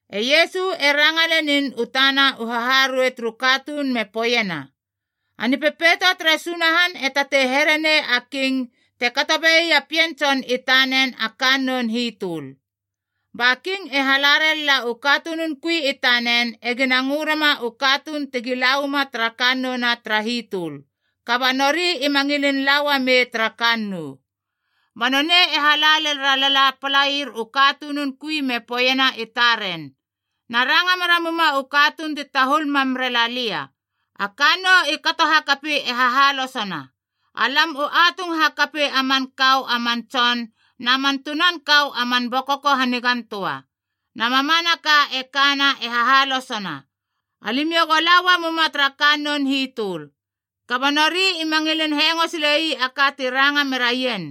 E Iesu e ranga lenin u tana u haharuei turu katuun me poeiena, “A Nipepeito tere Sunahan e tatei herenei a king te kato be ii a pien tson i tanen a kannoun hitöl. Ba king e hala ralala u katunun kui i tanen egina ngö rema u katuun tegi la uama tara kannouna tara hitöl, kaba nori ima ngilin la uamei tara kannou. “Ba nonei e hala lel ralala a palair u katunun kui me poeiena i taren, ‘Na ranga mera muma u katuun ti tahul mam rela lia, A kannou i kato hakapi e hahalosona. Alam u atung hakapi a man kau a man tson na man tunan kau a man bokoko hanigan töa. Na mamanaka e kana e hahalosona. Alimiou go la uamuma tara kannoun hitöl.’ Kaba nori ima ngilin hengo sile ii a ka ti ranga meraien,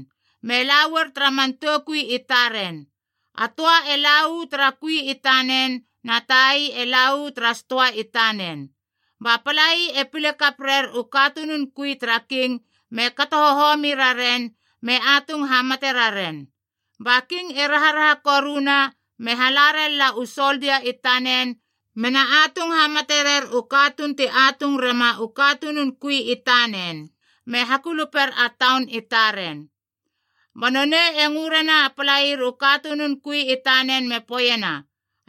me la uar tara man toukui i taren: a töa e la uu tara kui i tanen, na tai e la uu tara stoa i tanen. Ba palai e pile kap rer u katunun kui tara king me kato hohomi raren, me atung hamate raren. “Ba king e raharaha koruna, me hala ralala u soldia i tanen mena atung hamate rer u katuun ti atung rema u katunun kui i tanen, me hakuluper a taun i taren. Ba nonei e ngö rena a palair u katunun kui i tanen me poeiena,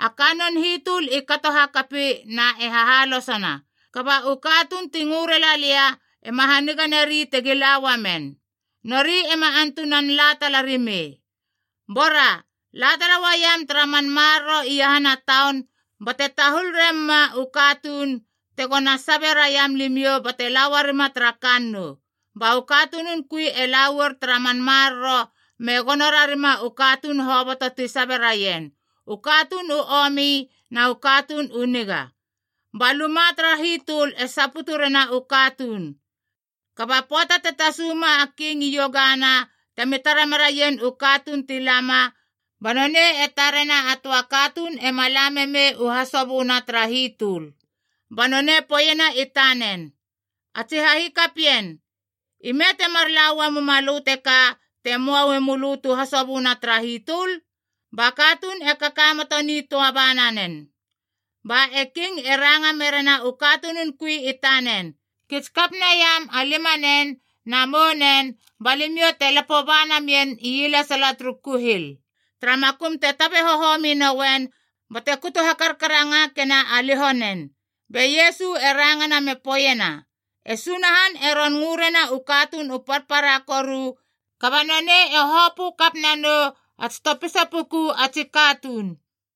‘A kannoun hitöl i kato hakapi na e hahalosona, kaba u katuun ti ngö rela lia ema haniga nari tegi la uamen. Nori ema antunan la tala rimei. Bora, la tala uaiam tara man maroro iahana taun bate tahul remuma u katuun tegona sabe raiam limiou bate lauaruma tara kannou.’ Ba u katunun kui e la uar tara man maroro me gono rarima u katuun hoboto ti sabe raien, u katuun u omi na u katuun u niga. Ba luma tara hitöl e saputu rena u katuun. “Kaba pöata te tasuma a king iogana temi tara meraien u katuun ti lama, ba nonei e tarena a töa katuun ema la memei u hasoböna tara hitöl. Ba nonei poeiena i tanen, ‘A tsi hahikapien, ime temar laua muma lö teka te möa uemölö tu hasoböna tara hitöl?’ Ba katuun e kakamoto nitöa bananen. Ba e king e ranga merena u katunun kui i tanen, ‘Kits kap naiam a limanen na mounen ba limiou te lapo ba namien ielesala turu kuhil, tara makum te tabe hohomi nouen bate kutu hakarkarangakena a liho nen.’” Be Iesu e rangana me poeiena, “E Sunahan e ron ngö rena u katuun u parpara koru, kaba nonei e hopö kap nanou a tsi topisa puku a tsi katuun.”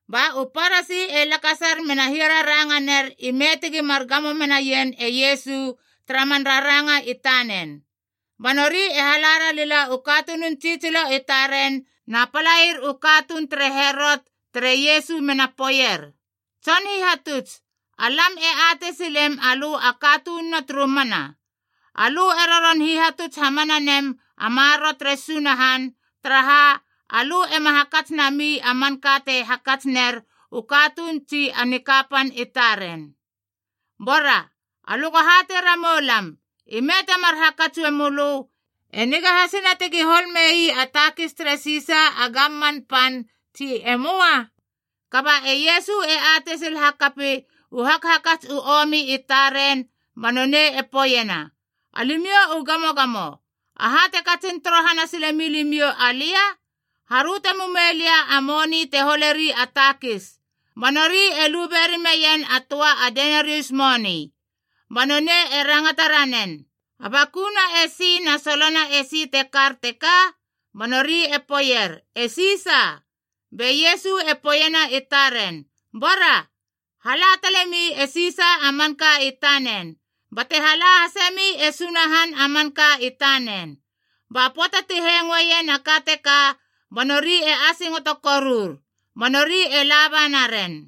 Ba u Parasi e lakasar mena hiararanganer ime tegi mar gamo menaien e Iesu tara man raranga i tanen. Ba nori e hala ralila u katunun tsitsilo i taren na palair u katuun tere Herot tere Iesu mena poeier, “Tson Hihatuts, alam e atei silem alö a katununa turu mana. Alö e roron hihatuts hamana nem a maroro tere Sunahan, taraha alö ema hakats nami a manka te hakats ner u katuun tsi a nikapan i taren. Bora, alö go hatei ramou lam, ime temar hakats uemölö, e niga hasina tegi hol mei a takis tere Sisa a gamman pan, tsi e möa?” Kaba e Iesu e atei sil hakapi u hakhakats u omi i taren, ba nonei e poeiena, “Alimiou u gamogamo! Aha te katsin torohana sile milimiou alia? Haröte mumei lia a moni te holeri a takis.” Ba nori e lube rimeien a töa a denarius moni. Ba nonei e rangata ranen, “A bakuna esi, na solona esi te kar teka?” Ba nori e poeier, “E Sisa.” Be Iesu e poeiena i taren, “Bara, hala talemi e Sisa a manka i tanen, bate hala hasemi e Sunahan a manka i tanen.” Ba pöata ti hengoeien a ka teka, ba nori e asingoto korur. Ba nori e laba naren.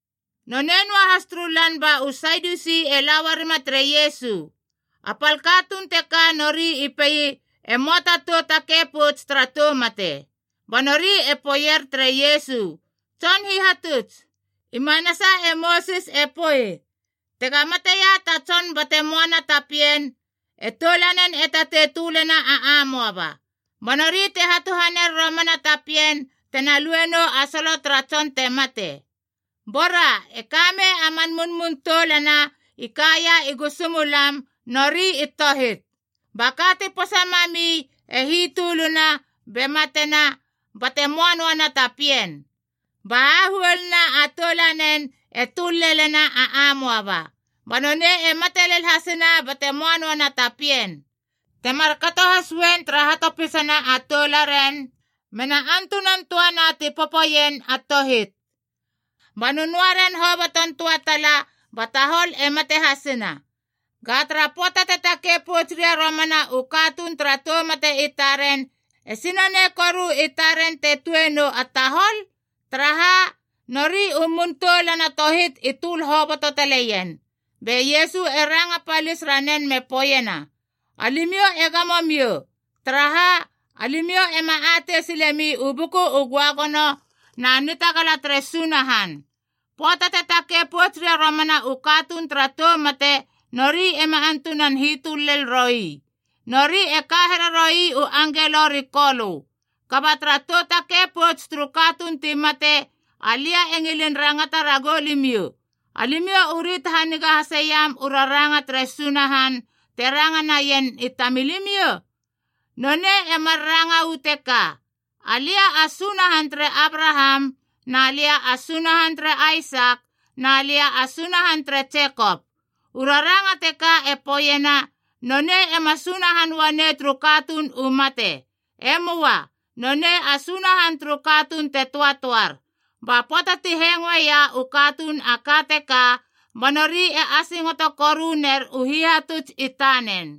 Nonei noahas turu lan ba u Sadiusi e la uarima tere Iesu. A pal katuun teka nori i pei e möa ta tou takei pouts tara tou mate. Ba nori i poeier tere Iesu, “Tson Hihatuts, i manasa e Mosis te poei, ‘Tega mateia ta tson bate möana ta pien, e toulanen e tatei tölena a amoaba, ba nori te hatuhaner romana ta pien tena luenou a solo tara tson te mate.’ Bora, e kamei a man munmun toulana i kaia i gusu mulam, nori i tohit. Ba ka ti posa mami e hitöluna, be matena bate möa noana ta pien. Ba hahuoluna a toulanen e töl lelena a amoaba. Ba nonei e mate lel hasina bate möa noana ta pien. Te markato has uen tara hatopisana a toularen, mena antunan töana ti popoien, a tohit. Ba nönöa ren hoboton töa tala, ba tahol e mate hasina. Ga tara pöata te takei pouts ria romana u katuun tara tou mate i taren, esi nonei koru i taren te tueie nou a tahol? Taraha, nori u mun toulana tohit i töl hoboto taleien.” Be Iesu e ranga palis ranen me poeiena, “Alimiou e gamo miou. Taraha, alimiou ema atei silemi u Buku u Göagono, na nitagala tere Sunahan. Pöata te takei pouts ria romana u katuun tara tou mate, nori ema antunan hitöl lel roi. Nori e ka hereroi u angelo ri Kolö. Kaba tara tou takei pouts turu katuun ti mate, alia e ngilin rangata ragou limiou: alimiou u rit haniga haseiam u raranga tere Sunahan te ranga naien i tamilimiou? Nonei e mar ranga uu teka: ‘Alia a Sunahan tere Abraham na lia a Sunahan tere Aisak na lia a Sunahan tere Jekop.’ U raranga teka e poeiena nonei ema Sunahan uanei turu katuun u mate. E möa. Nonei a Sunahan turu katuun te töatöar.” Ba pöata ti hengoeia u katuun a ka teka, ba nori e asingoto koru ner u hihatuts i tanen.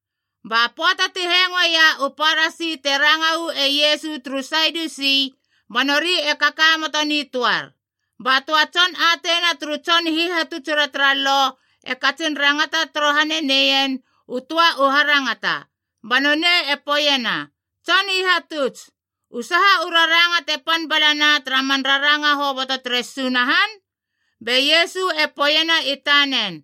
Ba pöata ti hengoeia u Parasi te rangau e Iesu turu Sadiusi, ba nori e kakamoto nitöar. Ba töa tson ateina turu tson hihatutsura tara Lo, e katsin rangata torohane neien u töa u harangata. Ba nonei e poeiena, “Tson Hihatuts, u saha u raranga te pan balana tara man raranga hoboto tere Sunahan?” Be Iesu e poeiena i tanen,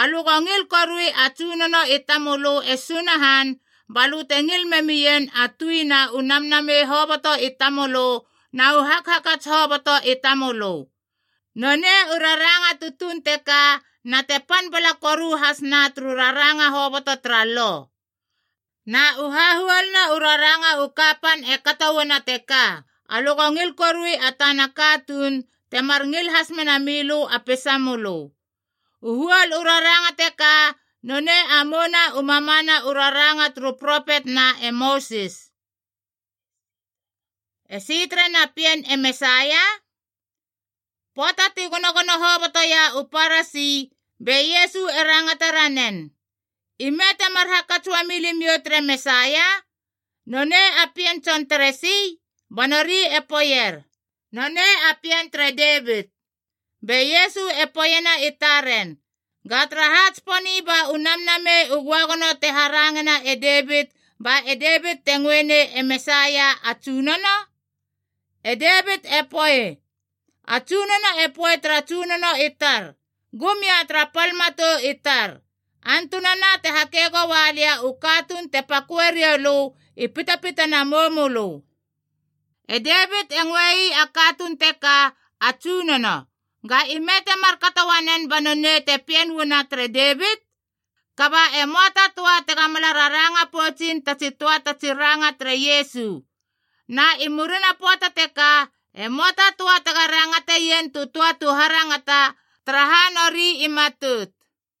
“Alö go ngil korui a Tsunono i tamölö e Sunahan, balö te ngil memien a tui na u namnamei hoboto i tamölö na u hakhakats hoboto i tamölö! Nonei u raranga tutuun teka na te pan bala koru hasna turu raranga hoboto tara Lo. Na u hahuoluna u raranga u kapan e kato uana teka, ‘Alö go ngil korui a tana katuun temar ngil has mena milö a peisamölö.’ U huol u raranga teka nonei a mouna u mamana u raranga turu propet na e Mosis.” Esi terena pien e Mesaia? Pöata ti gonogono hobotoia u Parasi, be Iesu e rangata ranen, “Ime temar hakats uami limiou tere Mesaia? Nonei a pien tson teresi?” Ba nori e poeier, “Nonei a pien tere Davit.” Be Iesu e poeiena i taren, “Ga taraha tsiponi ba u Namnamei u Göagono te harangena e Devit ba e Devit e ngöenei e Mesaia ‘A Tsunono’? E Devit e poei, ‘A Tsunono e poei tara tsunono i tar, Gum ia tara pal matou i tar, antunana te hake goalia u katuun te pakö rioulö i pitapitana a moumölö.’ “E Devit e ngöei a katuun teka, ‘A Tsunono.’ Ga ime te markato uanen ba nonei te pien uana tere Devit?” Kaba e möa ta töa tega mala raranga poutsin tatsi töa tatsi ranga tere Iesu. Na i murina pöata teka e möa ta töa tega rangate ien tu töa tu harangata, taraha nori i matout.